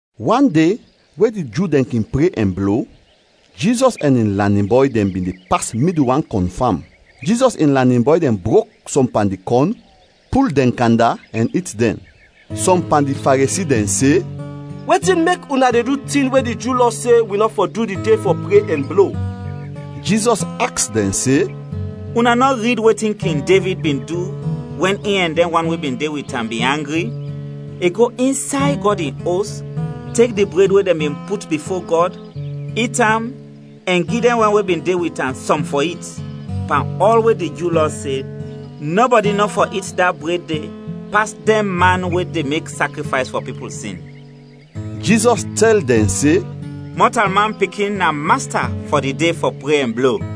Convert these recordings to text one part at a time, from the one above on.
Wan de we di Ju dɛn kin pre ɛn blo, Jizɔs ɛn in lanin bɔy dɛn bin de pas midul wan kɔn fam. Jizɔs in lanin bɔy dɛn brok sɔm pan di kɔn, pul dɛn kanda, ɛn it dɛn. Sɔm pan di Faresi dɛn se, “Wetin mek una de du tin we di Ju Lɔ se wi nɔ fɔ du di de fɔ pre ɛn blo?” Jizɔs aks dɛn se, “Una nɔ rid wetin King Devid bin du wɛn in ɛn dɛn wan we bin de wit am bin angri? I go insay Gɔd in Os, tek di bred we dɛn bin put bifo Gɔd, it am ɛn gi dɛn wan we bin de wit am sɔm fɔ it, pan ɔl we di Ju Lɔ se nɔbɔdi nɔ fɔ it da bred de pas dɛn man we de mek sakrifays fɔ pipul sin.” Jizɔs tɛl dɛn se, “Mɔtalman Pikin na Masta fɔ di de fɔ pre ɛn blo.”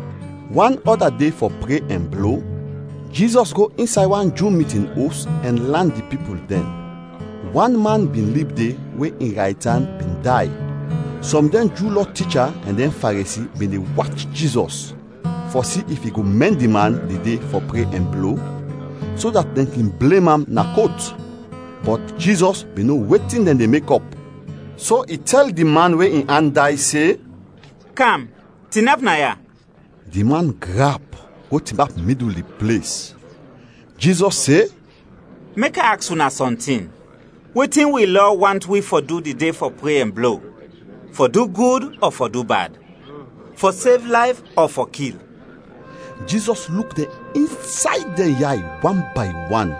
Wan ɔda de fɔ pre ɛn blo, Jizɔs go insay wan Ju mitin os ɛn lan di pipul dɛn. Wan man bin lib de we in raytan bin day. Sɔm dɛn Ju Lɔ ticha ɛn dɛn Faresi bin de wach Jizɔs fɔ si if i go mɛn di man di de fɔ pre ɛn blo, so dat dɛn kin blem am na kot. Bɔt Jizɔs bin no wetin dɛn de mekɔp, so i tɛl di man we in an day se, “Kam, tinap naya!” Di man grap, go tinap midul di ples. Jizɔs se, “Mek a aks una sɔntin. Wetin wi Lɔ want wi fɔ du di de fɔ pre ɛn blo? Fɔ du gud ɔ fɔ du bad? Fɔ sev layf ɔ fɔ kil?” Jizɔs luk dɛn insay dɛn yay wan bay wan,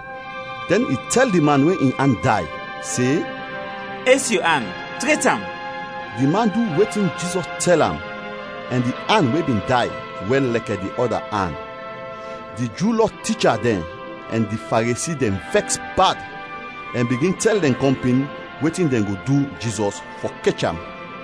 dɛn i tɛl di man we in an day se, “Es yu an, tret am!” Di man du wetin Jizɔs tɛl am ɛn di an we bin day wɛl lɛkɛ di ɔda an. Di Ju Lɔ ticha dɛn ɛn di Faresi dɛn vɛks bad ɛn bigin tɛl dɛn kɔmpin wetin dɛn go du Jizɔs fɔ kech am.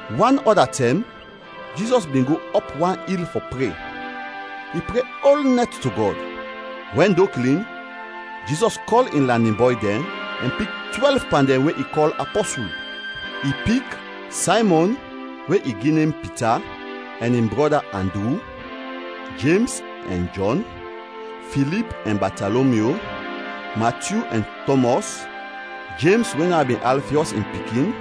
Wan ɔda tɛm, Jizɔs bin go ɔp wan il fɔ pre. I pre ol nɛt to Gɔd. Wɛn do klin, Jizɔs kɔl in lanin bɔy dɛn ɛn pik twɛlv pan dɛn we i kɔl apɔsul. I pik: Saymɔn (we i gi nem Pita) ɛn in brɔda Andru; Jems ɛn Jɔn, Filip ɛn Batalomyu, Matyu ɛn Tɔmɔs, Jems we na bin Alfiɔs in pikin,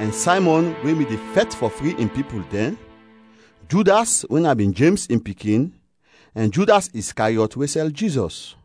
ɛn Saymɔn we bin de fɛt fɔ fri in pipul dɛn, Judas we na bin Jems in pikin, ɛn Judas Iskariɔt we sɛl Jizɔs.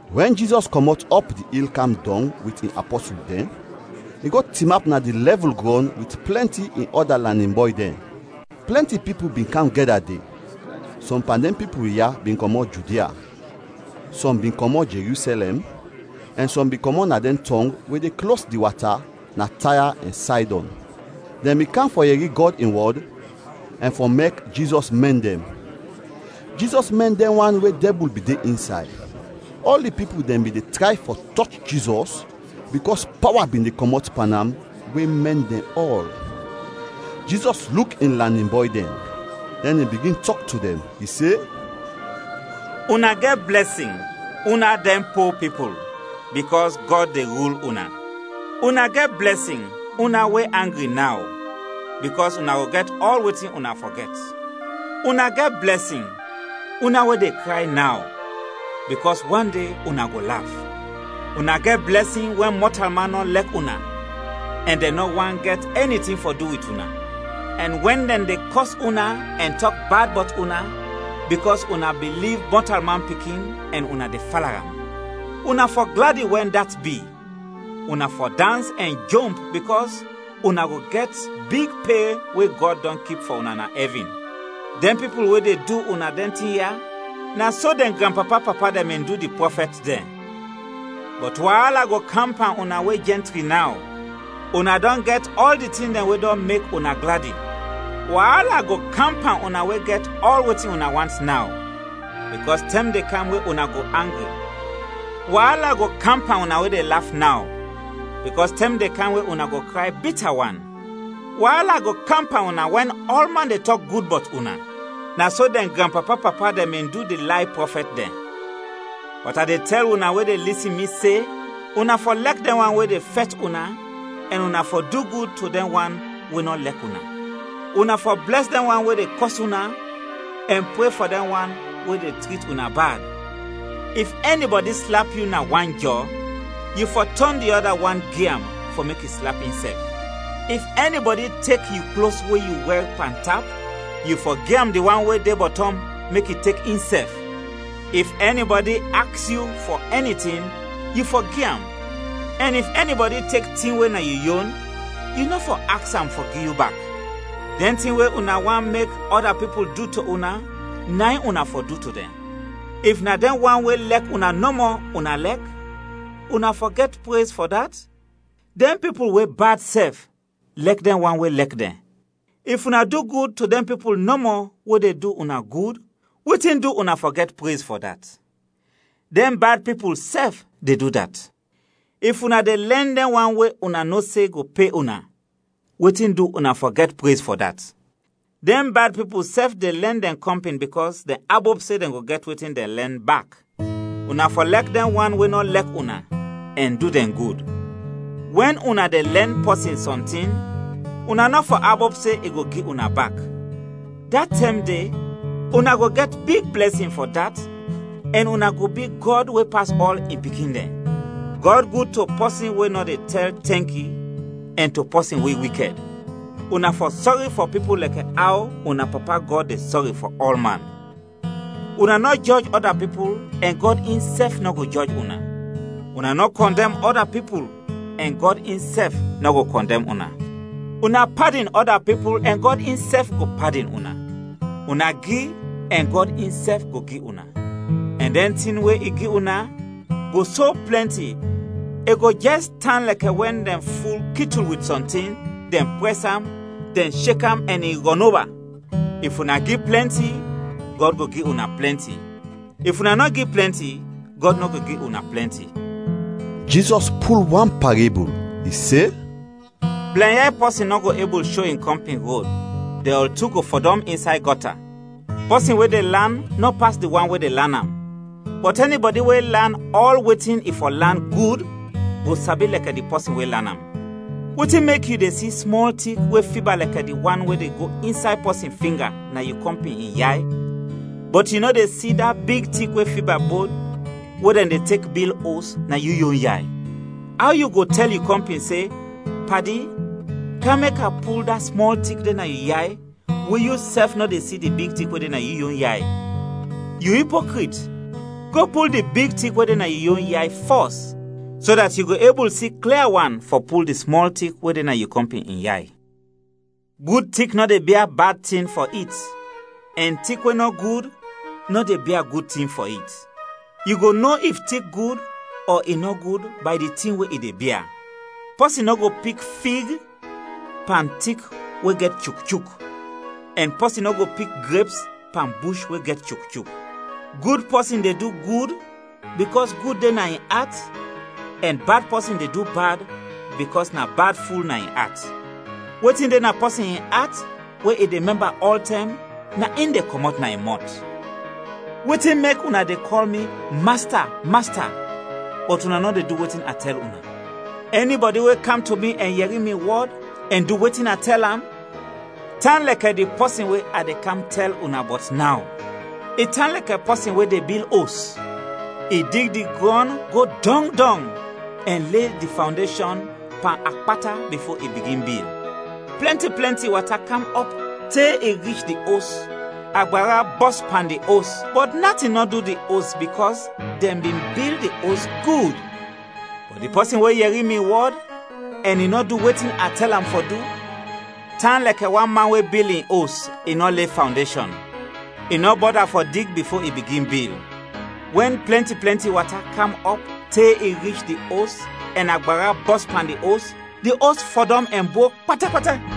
Wɛn Jizɔs kɔmɔt ɔp di il kam dɔng wit in apɔsul dɛn, i go tinap na di lɛvul grɔn wit plɛnti in ɔda lanin bɔy dɛn. Plɛnti pipul bin kam gɛda de, sɔm pan dɛn pipul ya bin kɔmɔt Judia, sɔm bin kɔmɔt Jerusɛlɛm, ɛn sɔm bin kɔmɔt na dɛn tɔng we de klos di wata na Taya ɛn Saydɔn. Dɛn bin kam fɔ yɛri Gɔd in wɔd ɛn fɔ mek Jizɔs mɛn dɛn. Jizɔs mɛn dɛn wan we dɛbul bin de insay. Ɔl di pipul dɛn bin de tray fɔ tɔch Jizɔs bikɔs pawa bin de kɔmɔt pan am we mɛn dɛn ɔl. Jizɔs luk in lanin bɔy dɛn, dɛn i bigin tɔk to dɛn. I se: “Una gɛt blɛsin, una dɛn po pipul, bikɔs Gɔd de rul una! “Una gɛt blɛsin, una we angri naw, bikɔs una go gɛt ɔl wetin una fɔ gɛt! “Una gɛt blɛsin, una we de kray naw, bikɔs wan de una go laf! “Una gɛt blɛsin wɛn mɔtalman nɔ lɛk una ɛn dɛn nɔ want gɛt ɛni tin fɔ du wit una, ɛn wɛn dɛn de kɔs una ɛn tɔk bad bɔt una, bikɔs una biliv Mɔtalman Pikin ɛn una de fala am! Una fɔ gladi wɛn dat bi, una fɔ dans ɛn jomp bikɔs una go gɛt big pe we Gɔd dɔn kip fɔ una na ɛvin! Dɛn pipul we de du una dɛn tin ya, na so dɛn granpapa-papa dɛn bin du di prɔfɛt dɛn. “Bɔt waala go kam pan una we jɛntri naw, una dɔn gɛt ɔl di tin dɛn we dɔn mek una gladi! “Waala go kam pan una we gɛt ɔl wetin una want naw, bikɔs tɛm de kam we una go angri! “Waala go kam pan una we de laf naw, bikɔs tɛm de kam we una go kray bita wan! “Waala go kam pan una wɛn ɔlman de tɔk gud bɔt una; na so dɛn granpapa-papa dɛn bin du di lay prɔfɛt dɛn. “Bɔt a de tɛl una we de lisin mi se, una fɔ lɛk dɛn wan we de fɛt una ɛn una fɔ du gud to dɛn wan we nɔ lɛk una. Una fɔ blɛs dɛn wan we de kɔs una ɛn pre fɔ dɛn wan we de trit una bad. If ɛnibɔdi slap yu na wan jɔ, yu fɔ tɔn di ɔda wan gi am fɔ mek i slap insɛf. If ɛnibɔdi tek yu klos we yu wɛr pantap, yu fɔ gi am di wan we de bɔtɔm, mek i tek insɛf. If ɛnibɔdi aks yu fɔ ɛni tin, yu fɔ gi am, ɛn if ɛnibɔdi tek tin we na yu yon, yu nɔ fɔ aks am fɔ gi yu bak. Dɛn tin we una want mek ɔda pipul du to una, na in una fɔ du to dɛn. “If na dɛn wan we lɛk una nɔmɔ una lɛk, una fɔ gɛt prez fɔ dat? Dɛn pipul we bad sɛf, lɛk dɛn wan we lɛk dɛn! If una du gud to dɛn pipul nɔmɔ we de du una gud, wetin du una fɔ gɛt prez fɔ dat? Dɛn bad pipul sɛf de du dat. If una de lɛn dɛn wan we una no se go pe una, wetin du una fɔ gɛt prez fɔ dat? Dɛn bad pipul sɛf de lɛn dɛn kɔmpin bikɔs dɛn abop se dɛn go gɛt wetin dɛn lɛn, bak! Una fɔ lɛk dɛn wan we nɔ lɛk una ɛn du dɛn gud. Wɛn una de lɛn pɔsin sɔntin, una nɔ fɔ abop se i go gi una bak; da tɛm de una go gɛt big blɛsin fɔ dat ɛn una go bi Gɔd we pas ɔl, in pikin dɛn. Gɔd gud to pɔsin we nɔ de tɛl tɛnki ɛn to pɔsin we wikɛd. Una fɔ sɔri fɔ pipul lɛkɛ aw una Papa Gɔd de sɔri fɔ ɔlman. “Una nɔ jɔj ɔda pipul ɛn Gɔd insɛf nɔ go jɔj una. Una nɔ kɔndɛm ɔda pipul ɛn Gɔd insɛf nɔ go kɔndɛm una. Una padin ɔda pipul ɛn Gɔd insɛf go padin una. Una gi ɛn Gɔd insɛf go gi una, ɛn dɛn tin we i gi una, go so plɛnti, i go jɛs tan lɛkɛ wɛn dɛn ful kitul wit sɔntin, dɛn prɛs am, dɛn shek am ɛn i rɔnoba. If una gi plɛnti, Gɔd go gi una plɛnti; if una nɔ gi plɛnti, Gɔd nɔ go gi una plɛnti.” Jizɔs pul wan parebul, i se: “Blɛnyay pɔsin nɔ go ebul sho in kɔmpin rod, dɛn ɔl tu go fɔdɔm insay gɔta. Pɔsin we de lan nɔ pas di wan we de lan am, bɔt ɛnibɔdi we lan ɔl wetin i fɔ lan, gud, go sabi lɛkɛ di pɔsin we lan am. “Wetin mek yu de si smɔl tik we fiba lɛkɛ di wan we de go insay pɔsin finga na yu kɔmpin in yay, bɔt yu nɔ de si da big tik we fiba bod we dɛn de tek bil os na yu yon yay? Aw yu go tɛl yu kɔmpin se, ‘Padi, kam mek a pul da smɔl tik de na yu yay’ we yusɛf nɔ de si di big tik na yu yon yay? Yu ipokrit! Go pul di big tik we de na yu yon yay fɔs, so dat yu go ebul si klia wan fɔ pul di smɔl tik we de na yu kɔmpin in yay. “Gud tik nɔ de bia bad tin fɔ it ɛn tik we nɔ gud nɔ de bia gud tin fɔ it. Yu go no if tik gud ɔ i nɔ gud bay di tin we i de bia. Pɔsin nɔ go pik fig pan tik we gɛt chukchuk, ɛn pɔsin nɔ go pik greps pan bush we gɛt chukchuk. Gud pɔsin de du gud bikɔs gud de na in at ɛn bad pɔsin de du bad bikɔs na bad ful na in at. Wetin de na pɔsin in at, we i de mɛmba ɔltɛm, na in de kɔmɔt na in mɔt. “Wetin mek una de kɔl mi ‘Masta, Masta,’ bɔt una nɔ de du wetin a tɛl una? Ɛnibɔdi we kam to mi ɛn yɛri mi wɔd ɛn du wetin a tɛl am, tan lɛkɛ di pɔsin we a de kam tɛl una bɔt naw. I tan lɛkɛ pɔsin we de bil os. I dig di grɔn go dɔng dɔng ɛn le di fawndeshɔn pan akpata bifo i bigin bil. Plɛnti plɛnti wata kam ɔp te i rich di os, agbara bɔs pan di os, bɔt natin nɔ du di os bikɔs dɛn bin bil di os gud. Bɔt di pɔsin we yɛri mi wɔd ɛn i nɔ du wetin a tɛl am fɔ du, tan lɛkɛ wan man we bil in os, i nɔ le fawndeshɔn; i nɔ bɔda fɔ dig bifo i bigin bil. Wɛn plɛnti plɛnti wata kam ɔp te i rich di os ɛn agbara bɔs pan di os, di os fɔdɔm ɛn brok pata pata!”